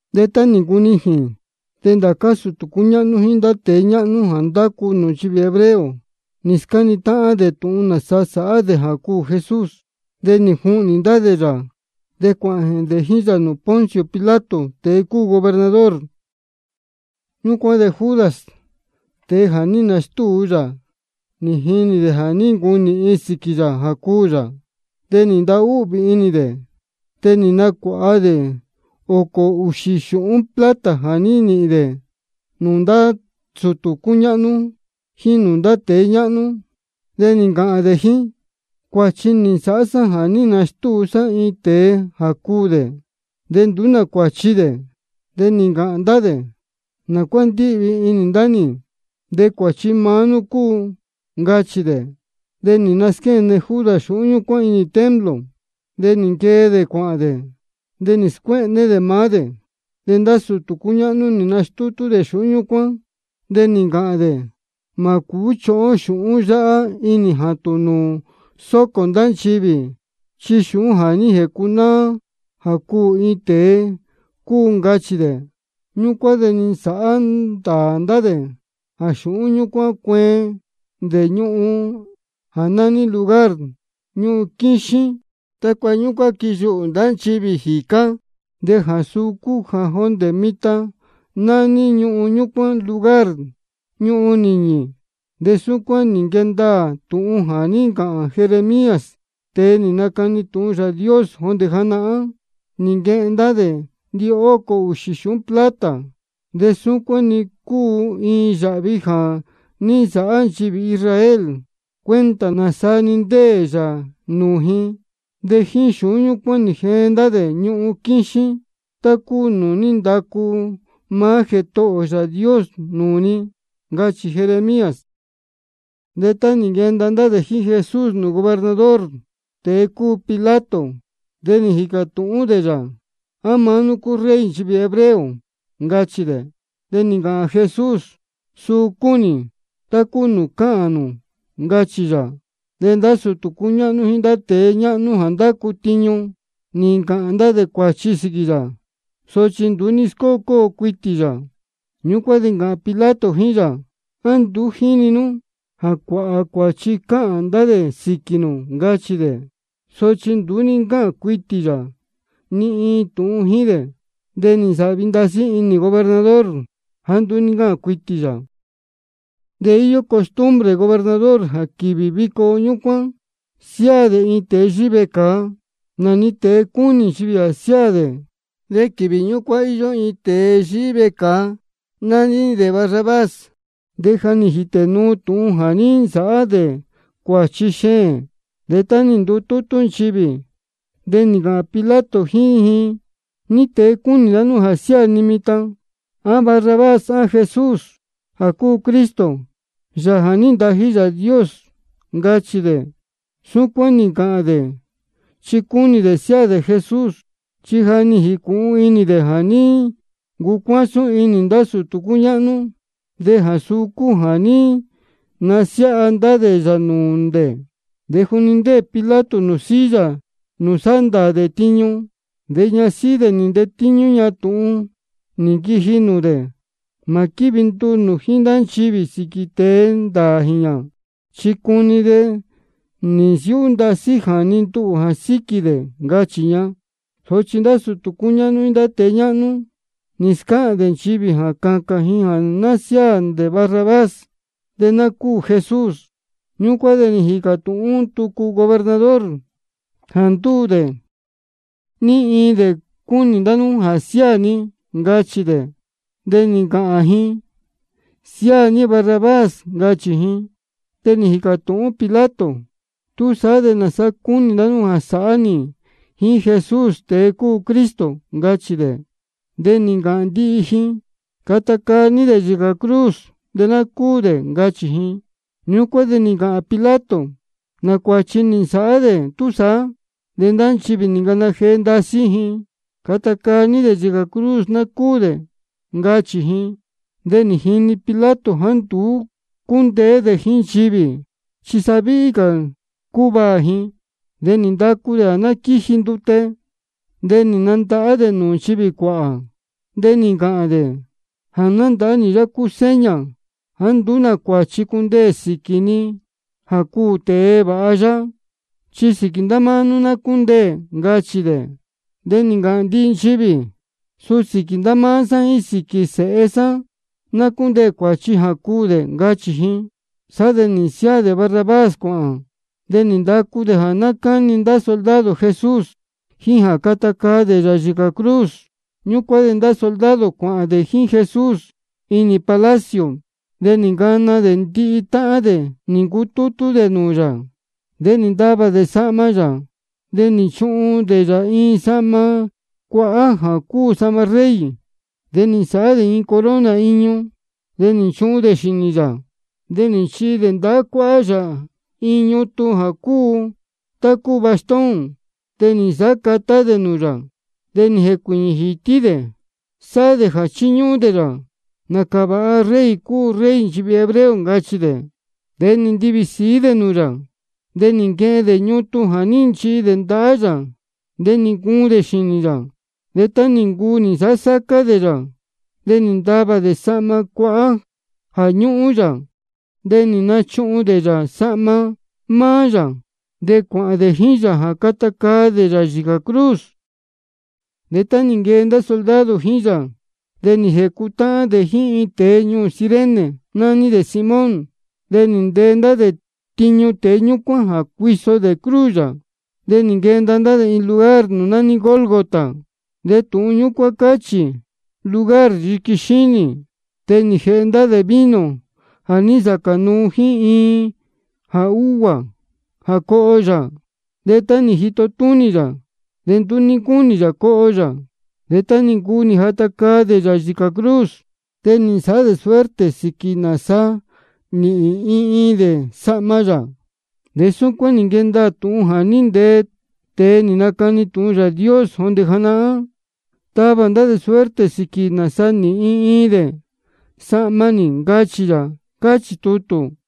De tá nī ncunijīn, de ndācá sūtū cúñáhnú jíín ndá tēe ñáhnú jā ndácu nūū nchivī hebreo, nī scáni táhán dē tūhun nāsa sāhá dē jā cuū Jesús. De nī juhnī ndá dē yā, de cuāhān dē jíín yā nūū Poncio Pilato, tēe cúu gobernador. Ñúcuán de Judas, tēe jā ní nastúu yā, nī jinī dē jā ní ncunīhin sīquī yā jā cuū yā. De nī ntahúhvī inī dē, de nī nacuāha dē ōcō ūxī xūhún plata jā ní nīhīn dē nūū ndá sūtū cúñáhnú jíín nūū ndá tēe ñáhnú. De nī ncāhān dē jíín: Cuāchi nī nsāhá sá jā ní nastúu sá iin tēe jā cuū dē, de nduú nā cuāchi dē. De nī ncāhān ndá dē: ¿Nā cuá ndíhvī inī ndá nī? De cuāchi maá nú cúu, ncachī dē. De nī nasquéne Judas xūhún ñúcuán inī templo. De nī nquee dē cuāhān dē, de nī scuéhné dē maá dē. De ndá sūtū cúñáhnú nī nastútú dē xūhún ñúcuán, de nī ncāhān dē: Mā cūú chuhun ó xūhún yáhá inī jātūn nūū sócō ndá nchivī, chi xūhún jā ní jēcunáá jā cuū iin tēe cúu, ncachī dē. Ñúcuán de nī nsāhá ndāā ndá dē jā xūhún ñúcuán cueen dē ñuhun jā nání Lugar Ñuhun Quíxín, tácua ñúcuán quiyuhū ndá nchivī jīcá. De jā suu cúu jā jondē mitan nání ñuhun ñúcuán Lugar Ñuhun Nīñī. De súcuán nī nquee ndaā tūhun nī ncāhān Jeremías, tēe nī nacani tūhun Yāā Dios jondē janahán: Nī nquehen ndá dē ndihócō ūxī xūhún plata, de súcuán-ni cúu iin yāhvi jā ní nsāhá nchivī Israel cuenta nāsaa-ni ndéē yā nūū ji. De jíín xūhún ñúcuán nī jeen ndá dē ñuhun quíxín, tá cúu nūū ní ndacu maá Jētohō ō Yāā Dios nūū ni. Ncachī Jeremías. De tá nī nquenda ndá dē jíín Jesús nūū gobernador, tēe cúu Pilato, de nī jīcā tūhún dē yā: ¿A maá nú cúu Rey nchivī hebreo? ncachī dē. De nī ncāhān Jesús: Suu cúu nī, tá cúu nūū cáhān nū, ncachī yā. De ndá sūtū cúñáhnú jíín ndá tēe ñáhnú jā ndácu tiñu, nī ncāhān dē cuāchi sīquī yā. Sochi nduú ní scócóo cuitī yā. Ñúcuán de nī ncāhān Pilato jíín yā: ¿A nduú jíni nú jā cuāhā cuāchi cáhān ndá dē sīquī nū? ncachī dē. Sochi nduú ní ncáhān cuitī yā ni iin tūhun jíín dē. De nī nsāhvi ndasí inī gobernador jāá nduú ní ncáhān cuitī yā. De íyó costumbre gobernador jā quīvī vico ñúcuán siáā dē iin tēe yíhí vecāa, nā-ni tēe cúnī nchivī jā siáā dē. De quīvī ñúcuán íyó iin tēe yíhí vecāa, nání dē Barrabás, de ja nī jītē nuu tūhun jā ní nsāhá dē cuāchi xeēn. De tá nī ndutútú nchivī, de nī ncāhān Pilato jíín ji: ¿Ní tēe cúnī ndá nú jā siáā ni mitan: A Barrabás á Jesús jā cúu Cristo, Yāā jā ní ntají Yāā Dios? ncachī dē. Súcuán nī ncāhān dē chi cúnī dē siáā dē Jesús. Chi ja nī jīcūhun inī dē jā ní ncucuásún inī ndá sūtū ñúcuán, de jā suu cúu jā ní nasiáha ndá dē yā nūū dē. De juni ndéē Pilato silla nūū sáhá ndāā dē tiñu, de ñasíhí dē nī ntetíñú ña tūhun nī nquiji nūū dē: Mā quívi nduū nū jíín ndá nchivī sīquī tēe ndāā jīñā, chi cuni de ndasí nī nsiúhú jāni nduhū jā síquī dē, ncachī ña. Sochi ndá sūtū cúñáhnú jíín ndá tēe ñáhnú, nī scáhān dē nchivī jā cācān ji jā ná siáā dē Barrabás, de ná cúū Jesús. Ñúcuán de nī jīcā tūhún tucu gobernador: Jā ndúū dē, ¿ní iin dē cúnī ndá nú jā siáā ni? ncachī dē. De nī ncāhān ji: Siáā ní Barrabás, ncachī ji. De nī jīcā tūhún Pilato: ¿Túsaá de nāsa cúnī ndá nú jā sāhá nī jíín Jesús, tēe cúu Cristo? ncachī dē. De nī ncāhān ndihi ji: Cata caa ní dē yīcā cruz, ná cúū dē, ncachī ji. Ñúcuán de nī ncāhān Pilato: ¿Nā cuāchi nī nsāhá dē túsaá? De ndá nchivī nī ncana jee ndasí ji: Cata caa ní dē yīcā cruz, ná cúū dē, ncachī ji. De nī jinī Pilato jāá nduú cúndeé dē jíín nchivī, chi sa víhí cā cúvaā ji. De nī ndacu dē jā ná quíji ndute, de nī nandahá dē nūū nchivī cuāhā. De nī ncāhān dē: Jā nándahá nī yáhá cúu seña jāá nduú nā cuāchi cundeē sīquī ni jā cuū tēe vāha yáhá. Chi sīquī ndá máá nú ná cúndeē, ncachī dē. De nī ncāhān ndihi nchivī: Suu sīquī ndá máá sá jíín sīquī sēhe sá ná cúndeē cuāchi jā cuū dē, ncachī ji. Sá de nī nsiáā dē Barrabás cuāhān. De nī ndacu dē jā ná cáni ndá soldado Jesús, jíín jā cata caa dē yā yīcā cruz. Ñúcuán de ndá soldado cuāhān dē jíín Jesús inī palacio. De nī ncana dē ndihi táhán dē nī ncutútú dē nūū yā. De nī ntavā ndá dē sahma yā, de nī nchuhun dē yā iin sahma cuahá jā cúu sahma rey. De nī nsāhá ndá dē iin corona iñu, de nī nchuhun dē xīnī yā. De nī nchihi dē ndahá cuáhá yā iin ñutun jā cúu tá cúu bastón. De nī nsāhá catá dē nūū yā, chi nī jēcuīñī jītí dē, sáhá dē jā chíñúhún dē yā. Nācā vāha rey cúu Rey nchivī hebreo, ncachī dē. De nī ntivī sīí ndá dē nūū yā. De nī naquehen dē ñutun jā ní nchihi dē ndahá yā, de nī ncuun dē xīnī yā. De tá nī ncuu nī nsāhá sácá dē yā, de nī ntavā dē sahma cuahá jā ñúhún yā, de nī nachuhun dē yā sahma maá yā. De cuāhān dē jíín yā jā cata caa dē yā yīcā cruz. De tá nī nquee ndá soldado jíín yā, de nī jēcutáhán dē jíín iin tēe ñuū Cirene, nání dē Simón. De nī ntee ndá dē tiñu tēe ñúcuán jā cuiso dē cruz yā. De nī nquenda ndá dē iin lugar nūū nání Gólgota, de tūhun ñúcuán cáhān: Lugar Yiqui Xínī. De nī jēhe ndá dē vino jā ní nsacā nuu jíín iin jā úguā jā coho yā. De tá nī jito túnī yā, de nduú ní ncúnī yā coho yā. De tá nī ncuu nī jata caa dē yā yīcā cruz, de nī nsāhá dē suerte sīquī nāsa nīhīn iin iin dē sahma yā. De súcuán nī nquee ndaā tūhun jā ní ntee tēe nī nacani tūhun Yāā Dios janahán: Tavā ndá dē suerte sīquī nāsa nīhīn iin iin dē sahma nī, ncachī yā, cáchī tutū.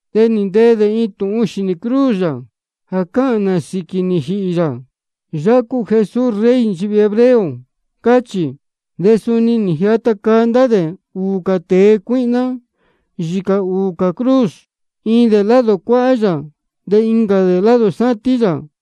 De nī ntee dē iin tūhun xīnī cruz yā jā cáhān nā sīquī nī jīhī yā: Yáhá cúu Jesús, Rey nchivī hebreo, cáchī. De suni nī jata caa ndá dē ūū tēe cuíhná yīcā ūū cā cruz, iin dē lado cuáhá yā, de incā dē lado sátín yā.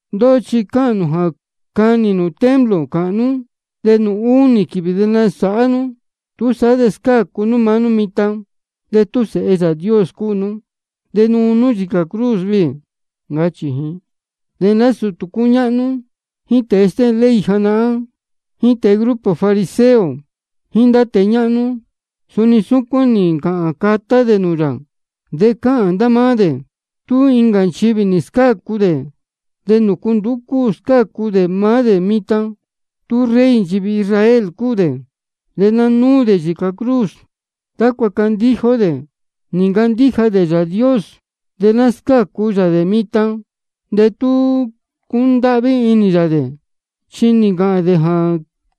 Ndóhó chi cáhān nū jā canī nū templo cāhnú, de nūū únī quīvī de nasāhá nú. Túsaá de scácu nú maá nú mitan. De tú Sēhe Yāā Dios cúu nú, de nuu nú yīcā cruz viī, ncachī ji. De ndá sūtū cúñáhnú, jíín tēe stéhēn ley janahán, jíín tēe grupo fariseo, jíín ndá tēe ñáhnú, suni súcuán nī ncāhān catá dē nūū yā, de cáhān ndá máá dē: Tú incā nchivī nī scácu dē, ¿de nūcu nduú cúu scácu dē maá dē mitan? Tú Rey nchivī Israel cúu dē, de ná núu dē yīcā cruz, tácua candíja ó dē. Nī ncandíja dē Yāā Dios, de ná scácu yā dē mitan de tú cúndáhví inī yā dē, chi nī ncāhān dē jā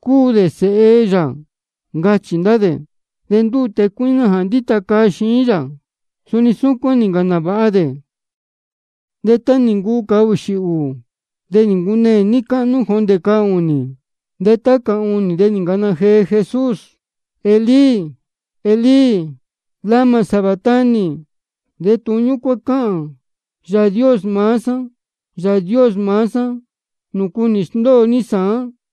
cúu dē Sēhe yā, ncachī ndá dē. De ndúū tēe cuíhná jā ndíta caa xiín yā, suni súcuán nī ncāhān nāvāha dē. De tá nī ncuu cahūxī ūū, de nī ncuneē níí cáhnú jondē cahūnī. De tá cahūnī, de nī ncana jee Jesús: Elí, Elí, ¿lama sabactani? De tūhun ñúcuán cáhān: Yāā Dios maá sá, Yāā Dios maá sá, ¿nūcu nī sndóo ní sāán?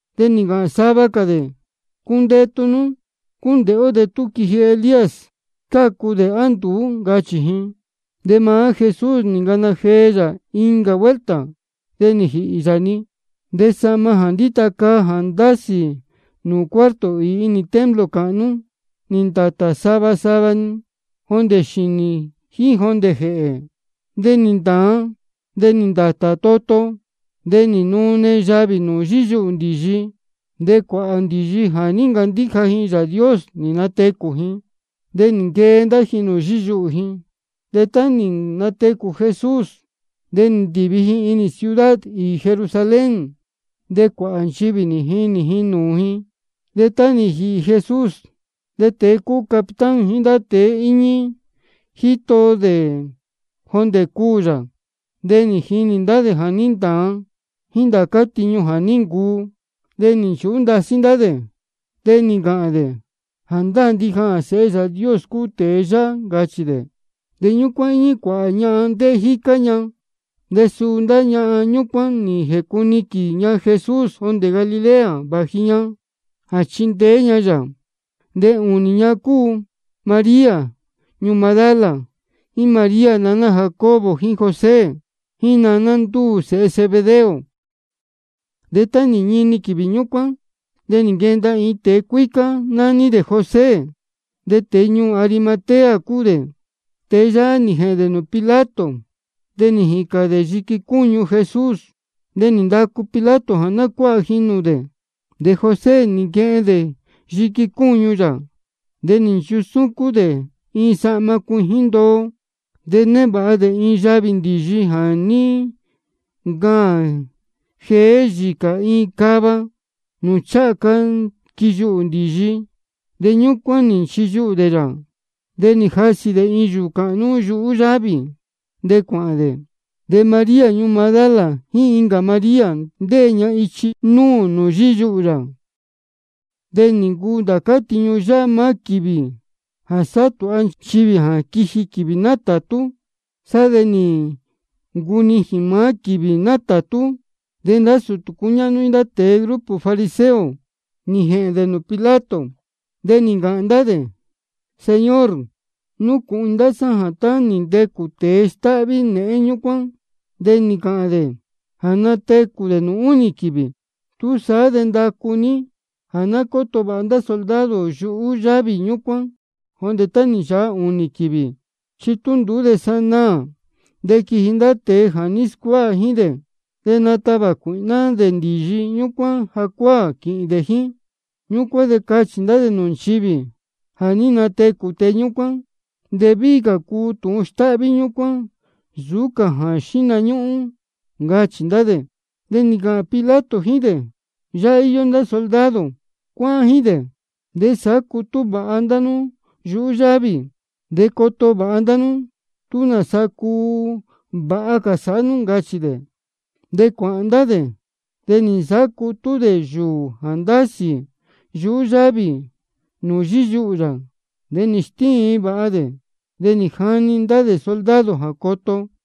De nī ncāhān sava cā dē: Cundetu nú, cúndēhé ó tú quiji Elías scácu dē á nduú, ncachī ji. De maá Jesús nī ncana jee yā incā vuelta, de nī jīhī yā-ni. De sahma jā ndíta caa jā ndásī nūū cuarto īī inī templo cāhnú, nī ndātā-ni sava sava jondē xīnī jíín jondē jēhē. De nī ntāan, de nī ndātā toto. De nī nune yavī nūū yíyuhū ndīyi, de cuāhā ndīyi jā ní ncandíja ji Yāā Dios, nī natecū ji. De nī nquee ndá ji nūū yíyuhū ji, de tá nī natecū Jesús de nī ndīvi ji inī ciudad īī Jerusalén, de cuāhā nchivī nī jinī nūū ji. De tá nī jīhī Jesús, de tēe cúu capitán jíín ndá tēe íñí jíín dē jā jíto dē jondē cuū yā, nī jinī ndá dē jā ní ntāan, jíín ndá cā tiñu jā ní ncuu. De nī nchūhú ndasí ndá dē, de nī ncāhān dē: Jāndáā ndija jā Sēhe Yāā Dios cúu tēe yáhá, ncachī dē. De ñúcuán íñí cuāhā ñahan, ndéhé jícá ña. De suu ndá ñahan ñúcuán nī jēcuniquīn ña Jesús jondē Galilea, vāji ña jā chíndeé ña yā. De ūnī ña cúu María ñuū Magdala, jíín María naná Jacobo jíín José, jíín naná ndúū sēhe Zebedeo. De tá nī ñini quīvī ñúcuán, de nī nquenda iin tēe cuícá, nání dē José, de tēe ñuū Arimatea cúu dē. Tēe yáhá nī jēhēn dē nūū Pilato, de nī jīcān dē yiqui cúñu Jesús. De nī ndacu Pilato jā ná cuáha ji nūū dē. De José nī nquehen dē yiqui cúñu yā, de nī nchusúcún dē iin sahma cuijín ndoo. De névāha dē iin yavī ndīyi jā ní ncaān jeé yīcā iin cava, nūū ncháha ca quiyuhū ndīyi. De ñúcuán nī nchiyuhū dē yā. De nī jasī dē iin yūū cāhnú yuhú yávī, de cuāhān dē. De María ñuū Magdala, jíín incā María, ndéē ña ichi núū nūū yíyuhū yā. De nī ncuu ndācá tiñu yáhá maá quīvī jā sáhá tūha nchivī jā quiji quīvī nátātú. Sá de nī ncunijīn maá quīvī nátātú. De ndá sūtū cúñáhnú jíín ndá tēe grupo fariseo, nī jēhēn dē nūū Pilato. De nī ncāhān ndá dē: Señor, núcūhun inī ndá sá jā tá nī ntecū tēe stáhví néhén ñúcuán, de nī ncāhān dē jā natecū dē nūū únī quīvī. Túsaá de ndacu ní jā ná cóto vāha ndá soldado yuhú yávī ñúcuán jondē tá nī nchāha ūnī quīvī. Chi tú nduú de sanaā de quiji ndá tēe jā ní scuáha jíín dē, de natavā cuīhná dē ndīyi ñúcuán jacuáā, quīhīn dē jíín. Ñúcuán de cachī ndá dē nūū nchivī jā ní natecū tēe ñúcuán. De víhí cā cuu tūhun stáhví ñúcuán nsūú cā jā xíhna ñúhún, ncachī ndá dē. De nī ncāhān Pilato jíín dē: Yáhá íyó ndá soldado. Cuáhán jíín dē, de sāhá cutú vāha ndá nú yuhú yávī, de coto vāha ndá nú, tú nāsa cuu vāha cā sāhá nú, ncachī dē. De cuāhān ndá dē, de nī nsāhá cutú dē yūū jā ndásī yuhú yávī nūū yíyuhū yā, de nī stíin vāha dē. De nī jani dē ndá soldado jā coto.